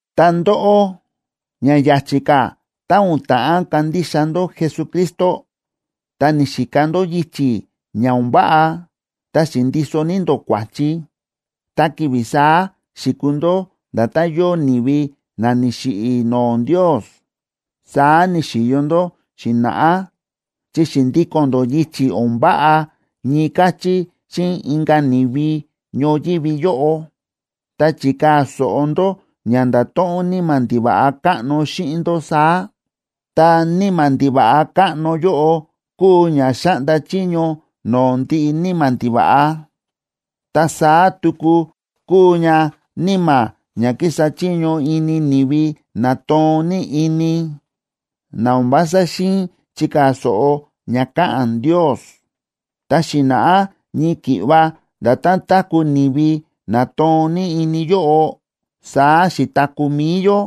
Ta ndóꞌó, ña ya̱chi̱ ka̱ tá o̱n ta̱ꞌán kandixa ndó Jesucristo, ta ni̱xika ndó yichi̱ ña o̱n váꞌa ta xi̱ndiso ní ndó kua̱chi, ta ki̱vi̱ saá xi̱kuu ndó nda̱tán yóo ni̱vi na ni̱xiꞌi̱ no̱o̱ Ndios. Saá ni̱xi̱yo ndó xi̱na̱ꞌá chi xi̱ndíko̱n ndó yichi̱ o̱n váꞌa ñii káchí xíꞌin inka̱ ni̱vi ñoyívi yóꞌo, ta chi̱kaa̱ so̱ꞌo ndó ña nda̱to̱ꞌon níma̱ ndiva̱ꞌa káꞌno xíꞌin ndó saá. Ta níma̱ ndiva̱ꞌa káꞌno yóꞌo kúu ña xáꞌnda chiño no̱o̱ ndiꞌi níma̱ ndiva̱ꞌa, ta saá tuku kúu ña níma̱ ña kísa chiño ini ni̱vi na toon ní ini, na o̱n vása xi̱in chikaa̱ so̱ꞌo ña káꞌa̱n Ndios. Ta xi̱na̱ꞌá ñii ki̱ꞌva nda̱tán táku̱ ni̱vi na toon ní ini yóꞌo, saá xi̱taku̱ mi̱i yó,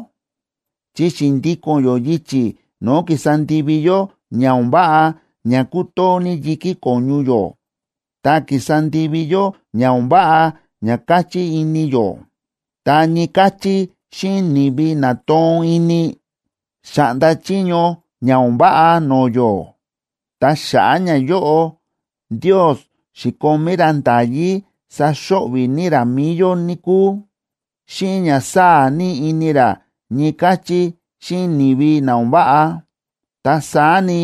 chi xi̱ndíko̱n yó yichi̱ no̱o̱ kísa ndivi yó ña o̱n váꞌa ña kútoo ní yi̱kí ko̱ñu yó, ta kísa ndivi yó ña o̱n váꞌa ña káchí ini yó. Ta ñii káchí xíꞌin ni̱vi na toon ini, xa̱ꞌnda chiño ña o̱n váꞌa no̱o̱ yó. Ta xa̱ꞌa̱ ñayóꞌo, Ndios xi̱komí ra nda̱yí saxo̱ꞌvi̱ ní ra mi̱i yó, níkúu, xíꞌin ña sáa̱ ní ini ra ñii káchí xíꞌin ni̱vi na o̱n váꞌa. Ta saá ni,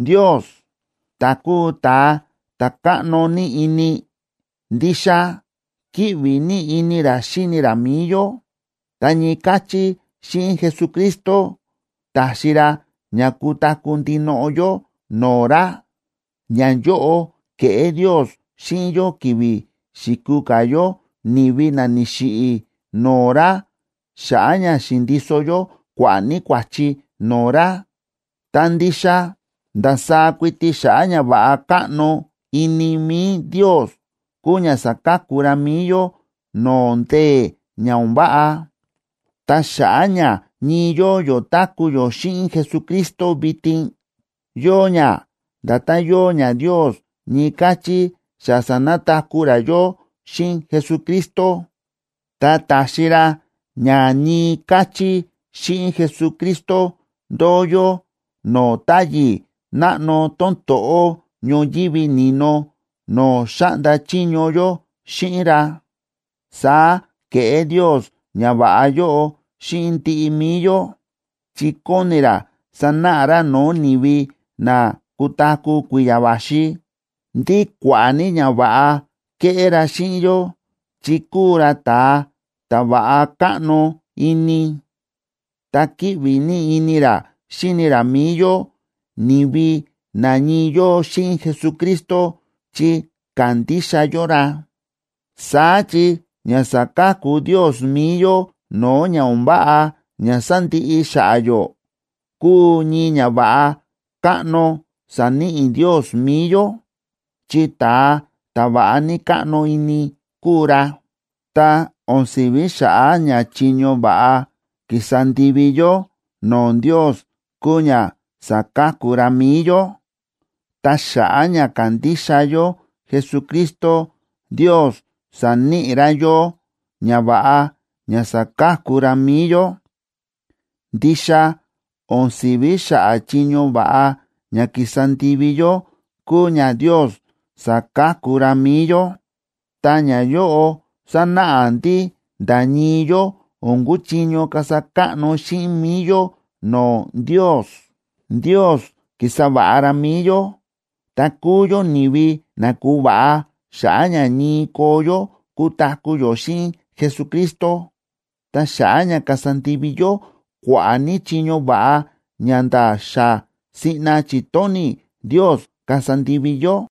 Ndios, ta̱ kúu ta̱a ta̱ káꞌno ní ini, ndixa kíꞌvi ní ini ra xíni ra mi̱i yó, ta ñii káchí xíꞌin Jesucristo, ta̱xi ra ña kutaku̱ ndinoꞌo yó no̱o̱ ra. Ñayóꞌo ke̱ꞌé Ndios xíꞌin yó ki̱vi̱ xi̱kuu ka̱ yó ni̱vi na ni̱xiꞌi̱ no̱o̱ ra xa̱ꞌa̱ ña xi̱ndiso yó kua̱ꞌa̱ ní kua̱chi no̱o̱ ra. Ta ndixa ndasaá kuiti xa̱ꞌa̱ ñava̱ꞌa káꞌno ini mi̱i Ndios kúu ña sa̱ka̱ku ra mi̱i yó no̱o̱ ndee̱ ña o̱n váꞌa. Ta xa̱ꞌa̱ ña ñii yóo yó táku̱ yó xíꞌin Jesucristo vitin, yóo ña nda̱tán yóo ña Ndios ñii káchí xa sa̱nataku̱ ra yó xíꞌin Jesucristo, ta ta̱xi ra ña ñii káchí xíꞌin Jesucristo ndóo yó no̱o̱ táyi̱ náꞌno tón to̱ꞌó ñoyívi ni̱no no̱o̱ xáꞌnda chiño yó xíꞌin ra. Saá ke̱ꞌé Ndios ñava̱ꞌa yóꞌo xíꞌin ndiꞌi mi̱i yó, chi kóni ra sanáꞌa ra no̱o̱ ni̱vi na kutaku̱ kui̱ya̱ va̱xi, ndí kua̱ꞌa̱ ní ñava̱ꞌa kéꞌé ra xíꞌin yó chi kúu ra ta̱a ta̱ va̱ꞌa káꞌno ini, ta kíꞌvi ní ini ra xíni ra mi̱i yó, ni̱vi na ñii yóo xíꞌin Jesucristo chi kándixa yó ra. Saá chi ña sa̱ka̱ku Ndios mi̱i yó no̱o̱ ña o̱n váꞌa ña sandiꞌi xa̱ꞌa̱ yó kúu ñii ñava̱ꞌa káꞌno sa̱níꞌi Ndios mi̱i yó, chi ta̱a ta̱ va̱ꞌa ní káꞌno ini kúu ra. Ta o̱n si̱ví xa̱ꞌa̱ ña chiño va̱ꞌa ki̱sa ndivi yó no̱o̱ Ndios kúu ña sa̱ka̱ku ra mi̱i yó. Ta xa̱ꞌa̱ ña ka̱ndixa yó Jesucristo, Ndios sa̱níꞌi ra yó ñava̱ꞌa ña sa̱ka̱ku ra mi̱i yó. Ndixa o̱n si̱ví xa̱ꞌa̱ chiño va̱ꞌa ña ki̱sa ndivi yó kúu ña Ndios sa̱ka̱ku ra mi̱i yó. Ta ñayóꞌo sánáꞌa ndí nda̱ ñii yó o̱n kúchiño kasa káꞌno xíꞌin mi̱i yó no̱o̱ Ndios. Ndios ki̱sa va̱ꞌa ra mi̱i yó, ta kúu yó ni̱vi na ku̱va̱ꞌa xa̱ꞌa̱ ña ñii koo yó kutaku̱ yó xíꞌin Jesucristo ta xa̱ꞌa̱ ña kasa ndivi yó kua̱ꞌa̱ ní chiño va̱ꞌa ña nda̱ xa siꞌna chi̱tóni̱ Ndios kasa ndivi yó.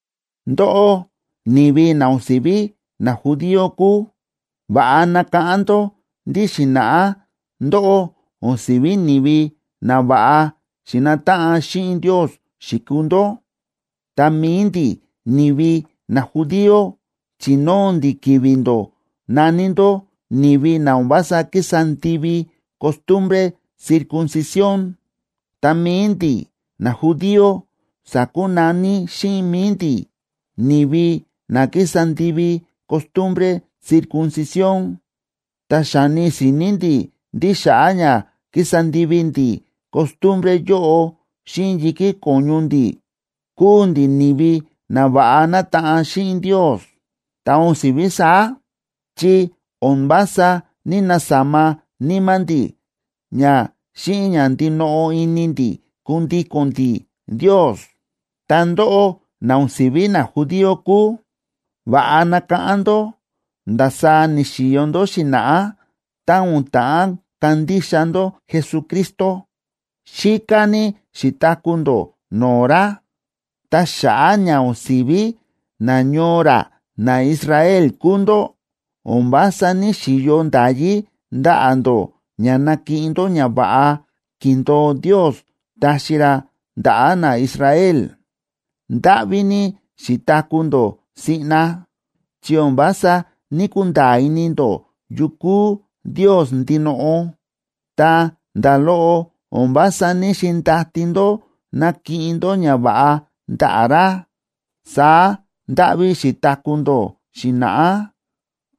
Ndóꞌó, ni̱vi na o̱n si̱ví najudío kúu, va̱ꞌa nakáꞌán ndó ndí xi̱na̱ꞌá ndóꞌó o̱n si̱ví ni̱vi na va̱ꞌa xi̱nataꞌan xíꞌin Ndios xi̱kuu ndó. Ta mi̱i ndi̱ ni̱vi najudío chi̱nóo ndi̱ ki̱vi̱ ndó, na̱ní ndó “ni̱vi na o̱n vása kísa ndivi costumbre circuncisión.” Ta mi̱i ndi̱ najudío sa̱kunaní xíꞌin mi̱i ndi̱ “ni̱vi na kísa ndivi costumbre circuncisión”,a ta xáni si̱ni̱ ndi̱ ndí xa̱ꞌa̱ ña ki̱sa ndivi ndi̱ costumbre yóꞌo xíꞌin yi̱kí ko̱ñu ndi̱, kúu ndi̱ ni̱vi na va̱ꞌa nátaꞌan xíꞌin Ndios, ta o̱n si̱ví saá, chi o̱n vása ní‑nasama níma̱ ndi̱ ña xíꞌin ña ndinoꞌo ini ndi̱ kundíko̱n ndi̱ Ndios. Ta ndóꞌó na o̱n si̱ví najudío kúu, va̱ꞌa nakáꞌán ndó ndasaá ni̱xi̱yo ndó xi̱na̱ꞌá tá o̱n ta̱ꞌán kandixa ndó Jesucristo. Xíká ní xi̱taku̱ ndó no̱o̱ ra, ta xa̱ꞌa̱ ña o̱n si̱ví nañoo ra naIsrael kúu ndó, o̱n vása ní‑xiyo nda̱yí ndaꞌa̱ ndó ña nakiꞌin ndó ñava̱ꞌa ki̱ndo̱o Ndios taxi ra ndaꞌa̱ naIsrael. Ndáꞌví ní xi̱taku̱ ndó siꞌna, chi o̱n vása ní‑kunda̱a̱ ini ndó yu kúu Ndios ndinoꞌo, ta nda̱ loꞌo o̱n vása ní‑xindati ndó nakiꞌin ndó ñava̱ꞌa ndaꞌa̱ ra. Saá ndáꞌví xi̱taku̱ ndó xi̱na̱ꞌá.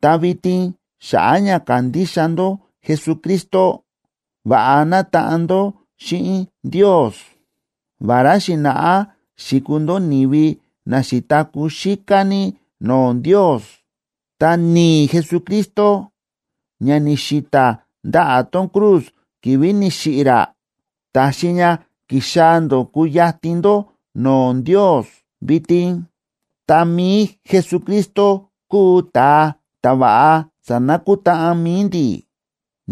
Ta vitin xa̱ꞌa̱ ña ka̱ndixa ndó Jesucristo, va̱ꞌa nátaꞌan ndó xíꞌin Ndios. Vará xi̱na̱ꞌá xi̱kuu ndó ni̱vi na xi̱taku̱ xíká ní no̱o̱ Ndios, ta ni̱i̱ Jesucristo, ña ni̱xi̱ta̱ ndaꞌa̱ tón cruz ki̱vi̱ ni̱xiꞌi̱ ra, ta̱xi ña ki̱xaa̱ ndó ku̱yatin ndó no̱o̱ Ndios vitin. Ta mi̱i Jesucristo kúu ta̱a ta̱ va̱ꞌa sa̱nakutáꞌan mi̱i ndi̱,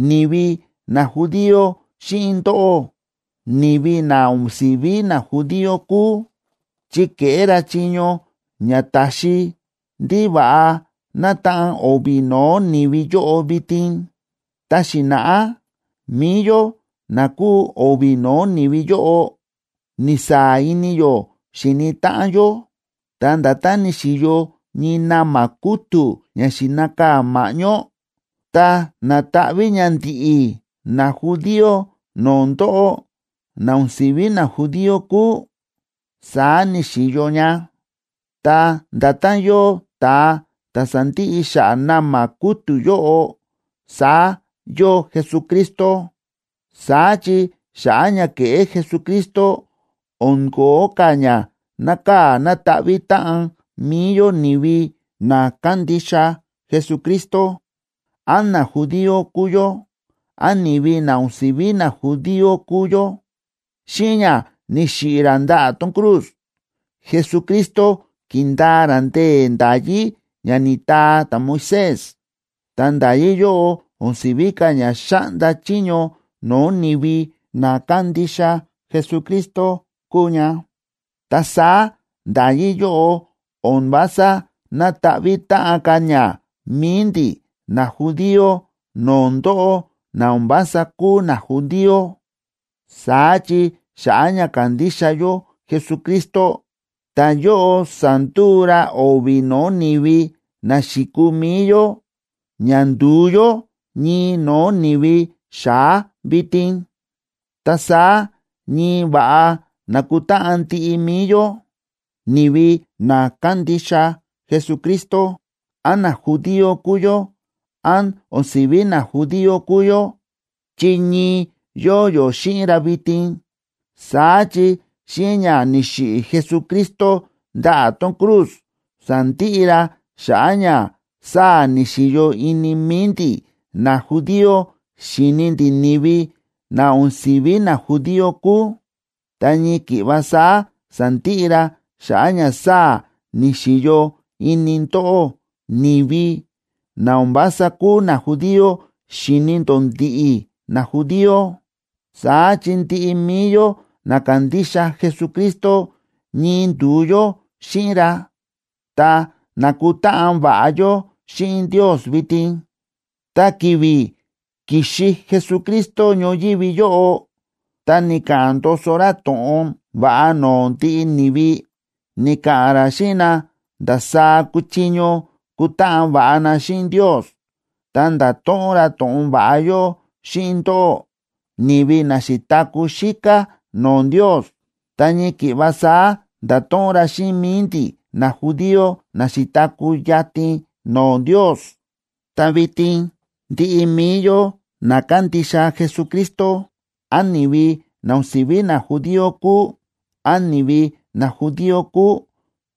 ni̱vi najudío xíꞌin ndóꞌó, ni̱vi na o̱n si̱ví najudío kúu, chi ke̱ꞌé ra chiño ña ta̱xi ndí va̱ꞌa nátaꞌan o̱vi̱ no̱o̱ ni̱vi yóꞌo vitin. Ta xi̱na̱ꞌá mi̱i yó na kúu o̱vi̱ no̱o̱ ni̱vi yóꞌo ni̱saa̱ ini yó xíni táꞌan yó, ta nda̱tán ni̱xi̱yo ñii na̱ma̱ kútu̱ ña xi̱nakaa̱ ma̱ꞌñó, ta na̱taꞌví ña ndi̱ꞌi̱ najudío no̱o̱ ndóꞌó na o̱n si̱ví najudío kúu, saá ni̱xi̱yo ña. Ta nda̱tán yóo ta̱a ta̱ sándiꞌi xa̱ꞌa̱ na̱ma̱ kútu̱ yóꞌo, saá yóo Jesucristo. Saá chi xa̱ꞌa̱ ña ke̱ꞌé Jesucristo, o̱n ko̱ó ka̱ ña nákaa̱ nátaꞌví táꞌan mi̱i yó ni̱vi na kándixa Jesucristo, án najudío kúu yó, án ni̱vi na o̱n si̱ví najudío kúu yó. Xíꞌin ña ni̱xiꞌi̱ ra ndaꞌa̱ tón cruz, Jesucristo ki̱ndaa ra ndee̱ nda̱yí ña ni̱taa ta̱Moisés, ta nda̱yí yóꞌo o̱n si̱ví ka̱ ña xáꞌnda chiño no̱o̱ ni̱vi na kándixa Jesucristo kúu ña. Ta saá nda̱yí yóꞌo o̱n vása nátaꞌví táꞌan ka̱ ña mi̱i ndi̱ najudío no̱o̱ ndóꞌó na o̱n vása kúu najudío. Saá chi xa̱ꞌa̱ ña ka̱ndixa yó Jesucristo, ta̱yóꞌo sa̱nduu ra o̱vi̱ no̱o̱ ni̱vi na xi̱kuu mi̱i yó ña ndu̱u yó ñii no̱o̱ ni̱vi xa̱á vitin. Ta saá ñii va̱ꞌa nákutáꞌan ndiꞌi mi̱i yó, ni̱vi na kándixa Jesucristo, án najudío kúu yó, án o̱n si̱ví najudío kúu yó, chi ñii yóo yó xíꞌin ra vitin. Saá chi xíꞌin ña ni̱xiꞌi̱ Jesucristo ndaꞌa̱ tón cruz, sa̱ndiꞌi ra xa̱ꞌa̱ ña sáa̱ ni̱xi̱yo ini mi̱i ndi̱ najudío xi̱ni ndi̱ ni̱vi na o̱n si̱ví najudío kúu. Ta ñii ki̱ꞌva saá sa̱ndiꞌi ra xa̱ꞌa̱ ña sáa̱ ni̱xi̱yo ini ndóꞌó ni̱vi na o̱n vása kúu najudío xi̱ni ndó ndi̱ꞌi̱ najudío. Saá chi ndiꞌi mi̱i yó na kándixa Jesucristo ñii ndu̱u yó xíꞌin ra, ta nákutáꞌan va̱ꞌa yó xíꞌin Ndios vitin. Ta ki̱vi̱ ki̱xi Jesucristo ñoyívi yóꞌo, ta ni̱ka̱ꞌa̱n ndoso ra to̱ꞌon va̱ꞌa no̱o̱ ndiꞌi ni̱vi, ni̱ka̱ꞌa̱n ra xíꞌin na ndasaá kuchiño kutáꞌan va̱ꞌa na xíꞌin Ndios. Ta nda̱to̱ꞌon ra to̱ꞌon va̱ꞌa yóꞌo xíꞌin ndóꞌó, ni̱vi na xi̱taku̱ xíká no̱o̱ Ndios, ta ñii ki̱ꞌva saá nda̱to̱ꞌon ra xíꞌin mi̱i ndi̱ najudío na xi̱taku̱ yatin no̱o̱ Ndios. Ta vitin ndiꞌi mi̱i yó na kándixa Jesucristo, án ni̱vi na o̱n si̱ví najudío kúu, án ni̱vi najudío kúu,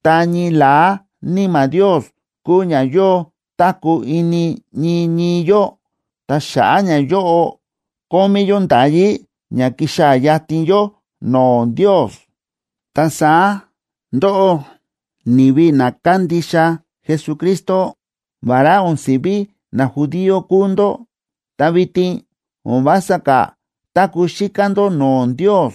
ta ñii la̱á Níma̱ Ndios kúu ña yóo táku̱ ini ñii ñii yó, ta xa̱ꞌa̱ ñayóꞌo, kómí yó nda̱yí ña kixaa̱ yatin yó no̱o̱ Ndios. Ta saá ndóꞌó, ni̱vi na kándixa Jesucristo, vará o̱n si̱ví najudío kúu ndó, ta vitin o̱n vása ka̱ táku̱ xíká ndó no̱o̱ Ndios,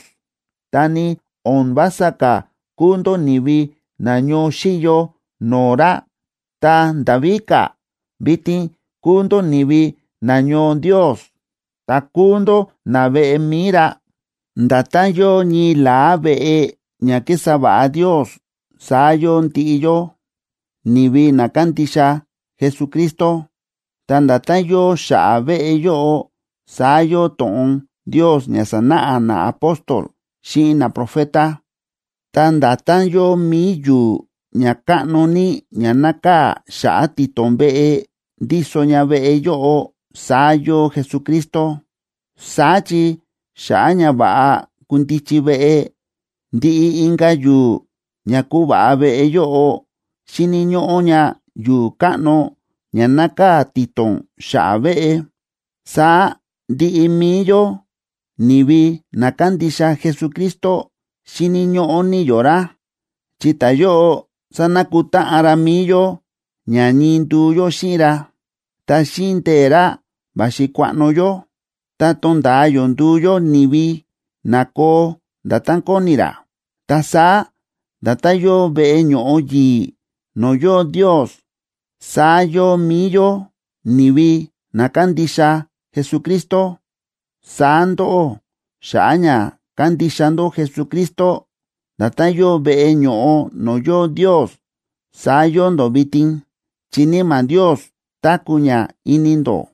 ta ni o̱n vása ka̱ kúu ndó ni̱vi na ñoo xíyo no̱o̱ ra. Ta nda̱ víka̱, vitin kúu ndó ni̱vi nañoo Ndios, ta kúu ndó naveꞌe mi̱i ra. Nda̱tán yóo ñii la̱á veꞌe ña kísa va̱ꞌa Ndios saá yóo ndiꞌi yó, ni̱vi na kándixa Jesucristo. Ta nda̱tán yóo xa̱ꞌa̱ veꞌe yóꞌo saá yóo to̱ꞌon Ndios ña sa̱náꞌa naapóstol xíꞌin naprofeta. Ta nda̱tán yóo mi̱i yu̱u̱ ña káꞌno ní ña nákaa̱ xa̱ꞌa̱ ti̱to̱n veꞌe, ndíso ña veꞌe yóꞌo, saá yóo Jesucristo. Saá chi xa̱ꞌa̱ ña va̱ꞌa kundichi veꞌe, ndiꞌi inka̱ yu̱u̱ ña kuva̱ꞌa veꞌe yóꞌo xíni̱ ñóꞌó ña yu̱u̱ káꞌno ña nákaa̱ ti̱to̱n xa̱ꞌa̱ veꞌe. Saá ndiꞌi mi̱i yó, ni̱vi na kándixa Jesucristo, xíni̱ ñóꞌó ní yó ra, chi ta̱yóꞌo sánakutáꞌan ra mi̱i yó ña ñii nduu yó xíꞌin ra, ta xíꞌin ndee̱ ra va̱xi kuaꞌno yó ta tonda̱a yó nduu yó ni̱vi na koo nda̱tán kóni ra. Ta saá nda̱tán yóo veꞌe ño̱ꞌo yi̱i̱ no̱o̱ yóo Ndios, saá yóo mi̱i yó ni̱vi na kándixa Jesucristo. Saá ndóꞌó, xa̱ꞌa̱ ña kándixa ndó Jesucristo, nda̱tán yóo veꞌe ño̱ꞌo no̱o̱ yóo Ndios, saá yóo ndó vitin, chi Níma̱ Ndios táku̱ ña ini ndó.